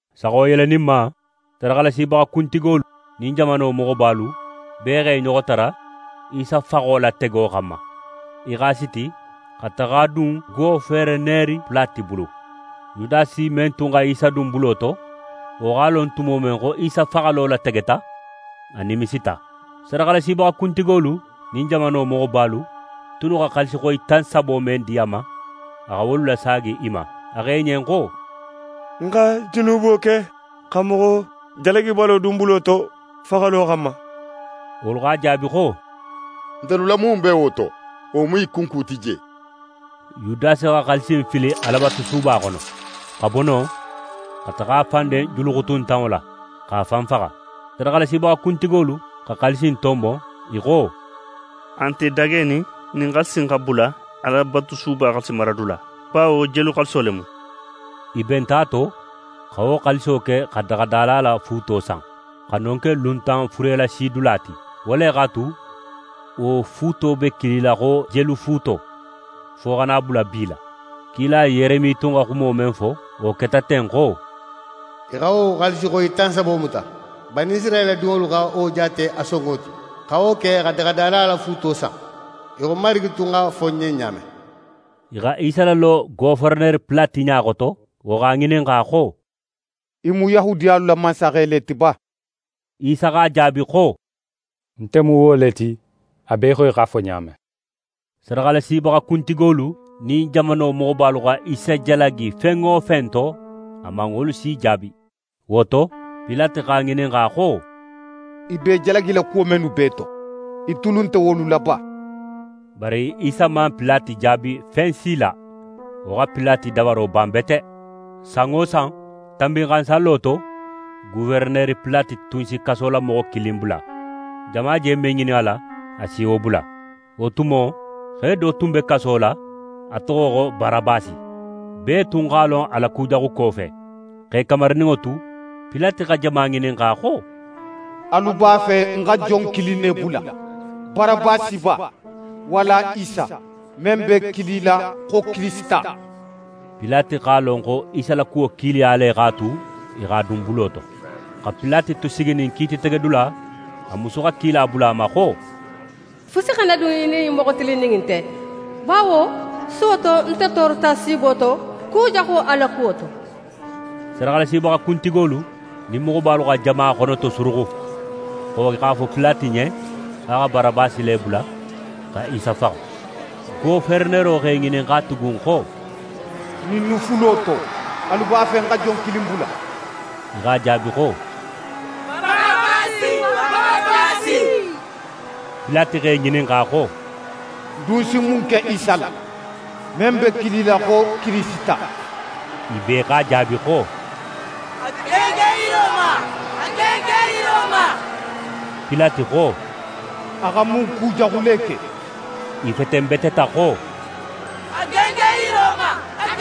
Saxo yeleninma, sadaxalasibaxa kuntigolu nin jamano moxobalu bee x'e ɲoxo tara Isa faxo latego xanma. I x'a siti xa taxa a dun Goferenere Pilate bulu. Yudasi men tun xa Isa dun bulo to, wo x'a lon tumo men xo Isa faxalo lategeta, a nimisita. Sadaxalasibaxa kuntigolu nin jamano moxobalu tunnu xa xaalisixoyi tan sabo men di a ma, a xa wolu lasaagi i ma. A xo i ɲen xo: «Ń xa junubo ke; xa moxo jalagibalo dun bulo to faxalo xanma.» Wolu x'a jaabi xo: «Ntelu la mun be wo to? Wo mu í kunku ti je.» Yudasi xa xaalisi innu fili Alabatusuba xono, xa bo non xa taxa a fan den julu xutuntanŋo la, x'a fan faxa. Sadaxalasibaxa kuntigolu xa xaalisi in tonbon, i xo: «A nte dagenin ɲin xaalisi in xa bula Alabatusuba xaalisimaradula, bawo jelu xaaliso le mu.» I benta a to, xa wo xaaliso ke xa daxadala la fuuto san, xa non ke luntan furelasidula ti. Wo le x'a tu, wo fuuto be kilila xo «Jelu fuuto» fo xa na a bula bi la. Kila Yeremi tun xa xumo men fo, wo keta ten xo: «I xa wo xaalisixoyi tan sabo muta, Banisirayila dinŋolu xa wo jaate a sonŋo ti; xa wo ke xa daxadala la fuuto san, í xo Marigi tun x'a fo ń ɲen ɲa men.» I xa Isa lalo Goferenere Pilate ɲa xoto, wo x'a ŋininxa xo: «Í mu Yahudiyalu la mansaxe le ti ba?» Isa x'a jaabi xo: «Nte mu wo le ti, a be í xo í x'a fo ɲa men.» Sadaxalasibaxa kuntigolu nin jamano moxobalu xa Isa jalagi fen wo fen to, a man wolu si jaabi. Wo to, Pilate x'a ŋininxa xo: «I be í jalagila kuwo mennu bee to, í tulu nte wolu la ba?» Bari Isa man Pilate jaabi fen si la. Wo xa Pilate dabaro ban bete. San wo san, Tanbinxansallo to, Goferenere Pilate tun si kasolamoxo kilin bula. Jama je men ŋinin a la, a si wo bula. Wo tumo, xe do tun be kaso la, a toxo xo Barabasi. Bee tun x'a lon a la kujaxuko fe. X'e kamarininŋo tu, Pilate xa jama ŋininxa xo: «Alu b'a fe ń xa jon kilin ne bula, Barabasi ba, walla Isa, men be kilila xo Kirisita?» Pilate x'a lon xo Isa la kuwo kiiliya le x'a tu, i x'a dun bulo to. Xa Pilate tu siginin kiititegedula, a musu xa kila bula a ma xo: «Fusi xana dun í nin ɲin moxo tilinnin in te, bawo suwo to, nte toorota siibo to kujaxu a la kuwo to.» Sadaxalasibaxa kuntigolu nin moxobalu xa jama xonotosuruxu, xo i x'a fo Pilate ɲen xo a xa Barabasi le bula, xa Isa faxa. Goferenero x'e ŋininxa tugun xo: «Ɲinnu fulo to, alu b'a fe ń xa jon kilin bula?» I x'a jaabi xo: «Barabasi.» Pilate x'e ŋininxa xo: «Ń dun si mun ke Isa la, men be kilila xo Kirisita?» I bee x'a jaabi xo: «A gengen yiro ma!» Pilate xo: «A xa mun kujaxu le ke?» I fetenbeteta xo: «A gengen yiro ma!»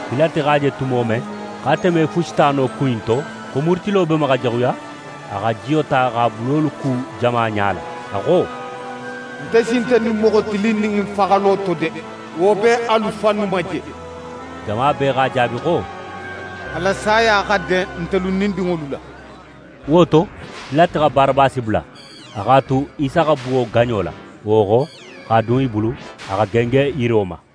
Pilate x'a je tumo men xo ate me fusi ta no ku in to, xo murutilo be ma xa jaxuya, a xa jiyo ta x'a bulolu ku jama ɲala. A xo: «Nte sin nte ɲin moxo tilinnin in faxalo to de, wo be alu fannu ma je.» Jama bee x'a jaabi xo: «A la saya xa den ntelu nin n dinŋolu la.» Wo to, Pilate xa Barabasi bula, a x'a tu Isa xa buwo gaɲo la, wo xo, x'a dun i bulu, a xa gengen yiro ma.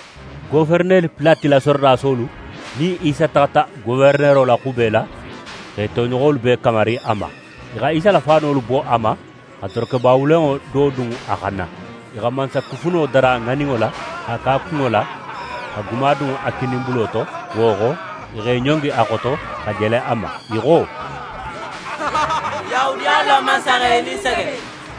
Goferenere Pilate la sorodasolu nin Isa taxata goferenero la xube la, x'e toɲoxolu bee kamari a ma. I xa Isa la faanolu bo a ma, xa dorokeba wulenŋo do dun a xanna. I xa mansakufuno dara ŋaninŋo la, x'a ke a kunŋo la, xa guma dun a kininbulo to. Wo xo, i x'e ɲongi a xoto, xa jele a ma, i xo: «Yahudiyalu la mansaxe, í nin sege!»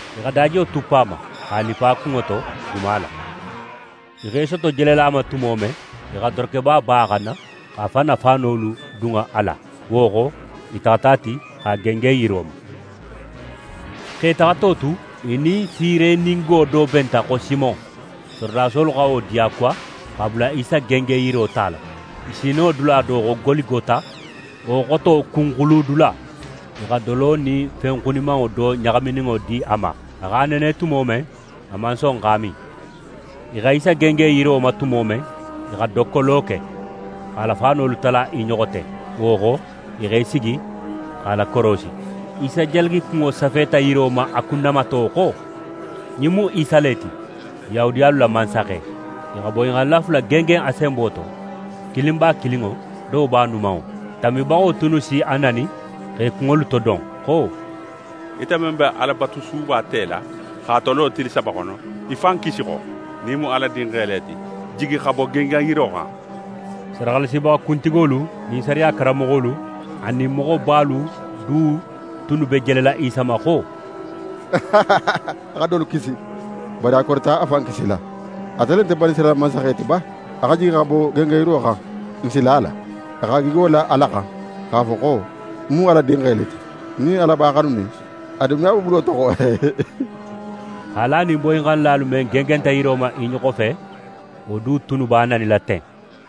I xa dajiyo tuppu a ma, x'a lippa a kunŋo to guma la. I x'e soto jelela a ma tumo men, i xa dorokeba bo a xanna, x'a fan na faanolu dun a la. Wo xo, i taxata a ti, x'a gengen yiro ma. X'e taxato tu, i nin Sireningo do benta xo Simon. Sorodasolu xa wo diyakuwa, x'a bula Isa gengenyiro tala. I sininŋo dula do xo Goligota, wo xoto: «Kunxuludula», i xa dolo nin fen xunimanŋo do ɲaxamininŋo di a ma. A x'a nene tumo men, a man son x'a min. I xa Isa gengen yiro ma tumo men, i xa dokkolo ke, x'a la faanolu tala i ɲoxo te. Wo xo, i x'e sigi x'a lakorosi. Isa jalagikunŋo safeta yiro ma a kunnamato xo: «Ɲin mu Isa le ti, Yahudiyalu la mansaxe.» I xa boyinxannila fula gengen a senbo to. Kilin b'a kininŋo, do b'a numanŋo. Tanbibaxolu tunnu si a nani, x'e kunŋolu todon xo: «Ite men be Alabatusuba tela, x'a tolo tili saba xono, í fan kisi xo. Nin í mu Ala Dinxe le ti, jigi xa bo gengenyiro xan!» Sadaxalasibaxa kuntigolu nin sariya karanmoxolu anin moxobalu du tunnu be jelela Isa ma xo: «A xa dolu kisi, bari a korita a fan kisila. Ate le nte Banisirayila mansaxe ti ba? A xa jigi xa bo gengenyiro xan, n si la a la! A x'a gigo la Ala xan, x'a fo xo: “Ń mu Ala Dinxe le ti!” Nin Ala b'a xanunin, a dun me a bo bulo to!» Haali a nin boyinxannila mennu gengenta yiro ma i ɲoxo fe, wo du tunnu b'a nanila ten.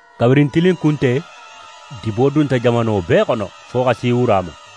Kabirin tilinkunte, dibo dunta jamano bee xono, fo xa si wura ma.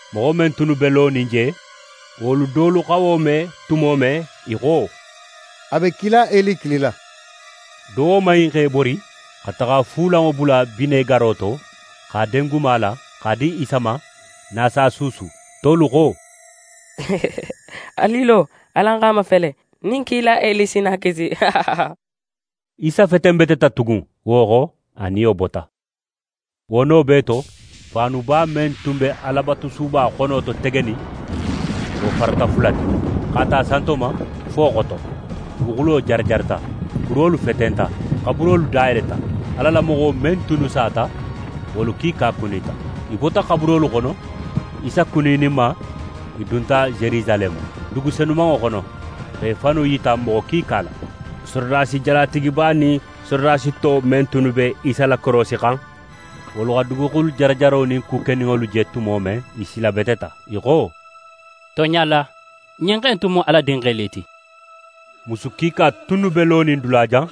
Moxo men tunnu be lonin je, wolu dolu xa wo me tumo men, i xo: «A be kila Eli kilila!» Do woman in x'é bori xa taxa fuulanŋo bula binegaro to, x'a den guma la, x'a di Isa ma, nin a s'a suusu. Tolu xo: «Alu i lo, alan x'a mafele nin kila Eli si na a kisi.» Isa fetenbeteta tugun, wo xo, a niyo bota. Wo no bee to, faanuba men tun be Alabatusuba xonototegenin, wo farata fula ti, x'a ta santo ma fo xoto. Duguxulo jarajarata, kurolu fetenta. Xaburolu dayeleta, Ala la moxo men tunnu sata, wolu kiika kunita. I bota xaburolu xono. Isa kunininma, i dunta Yerusaleme, dugu senumanŋo xono, x'e fannu yita moxo kiika la. Sorodasi jalatigiba nin sorodasi to men tunnu be Isa lakorosixan, wolu xa duguxulu jarajaro nin ku keninŋolu je tumo men, i silabeteta. I xo: «Tonɲa la, ɲin xe in tun mu Ala Dinxe le ti!» Musu kiika tunnu be lonin dulajan,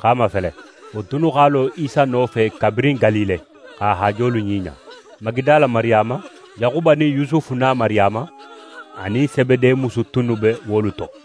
x'a mafele. Wo tunnu x'a lo Isa nofe kabirin Galile, x'a haajolu ɲiɲa. Magidala Mariyama, Yaxuba nin Yusufu na Mariyama, anin Sebede musu tunnu be wolu to.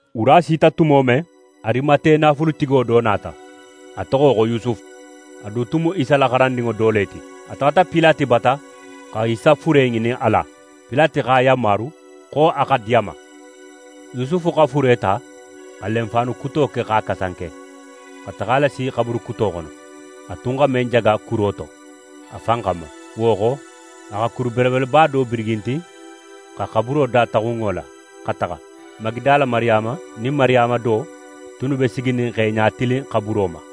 Wura sita tumo men, Arimate naafulutigo do nata. A toxo xo Yusufu, a du tun mu Isa la xarandinŋo do le ti. A taxata Pilate bata, xa Isa fure ŋinin a la. Pilate x'a yanmaru xo a xa di a ma. Yusufu xa fure ta, xa lenfaanu kuto ke x'a kasanke, xa taxa a lasi xaburu kuto xono, a tun xa men jaga kuro to a fan xanma. Wo xo, a xa kuru belebeleba do birigintin, xa xaburo dataxun wo la, xa taxa. Magidala Mariyama nin Mariyama do tunnu be siginin x'e ɲatilin xaburo ma.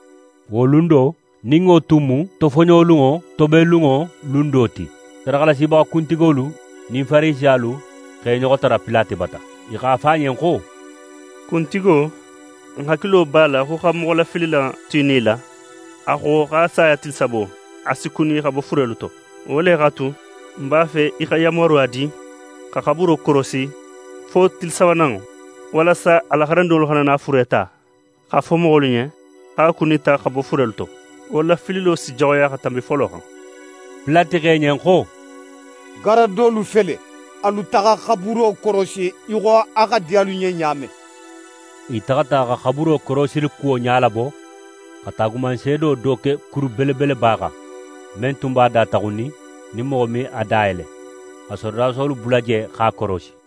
Wo lun do, nin wo tun mu tofoɲolunŋo tobenlunŋo lun do ti, sadaxalasibaxa kuntigolu nin Farisiyalu x'e ɲoxo tara Pilate bata. I x'a fo a ɲen xo: «Kuntigo, n hakilo b'a la xo xa moxolafilila in tu í nila, a xo xo a saya tili sabo, a si kuni xa bo furelu to. Wo le x'a tu, n b'a fe í xa yanmaruya di xa xaburo korosi fo tili sabananŋo, walasa a la xarandinŋolu xana na a fure ta, x'a fo moxolu ɲen xo a kunita xa bo furelu to. Wo lafililo si jaxuya xa tanbi folo xan.» Pilate xo i ɲen xo: «Garadolu fele, alu taxa xaburo korosi, í xo a xa di alu ɲen ɲa men.» I taxata xa xaburo korosilikuwo ɲalabo, xa taagumanseedo do ke kuru belebeleba xan, men tun b'a dataxunnin, nin moxo me a dayele, xa sorodasolu bula je x'a korosi.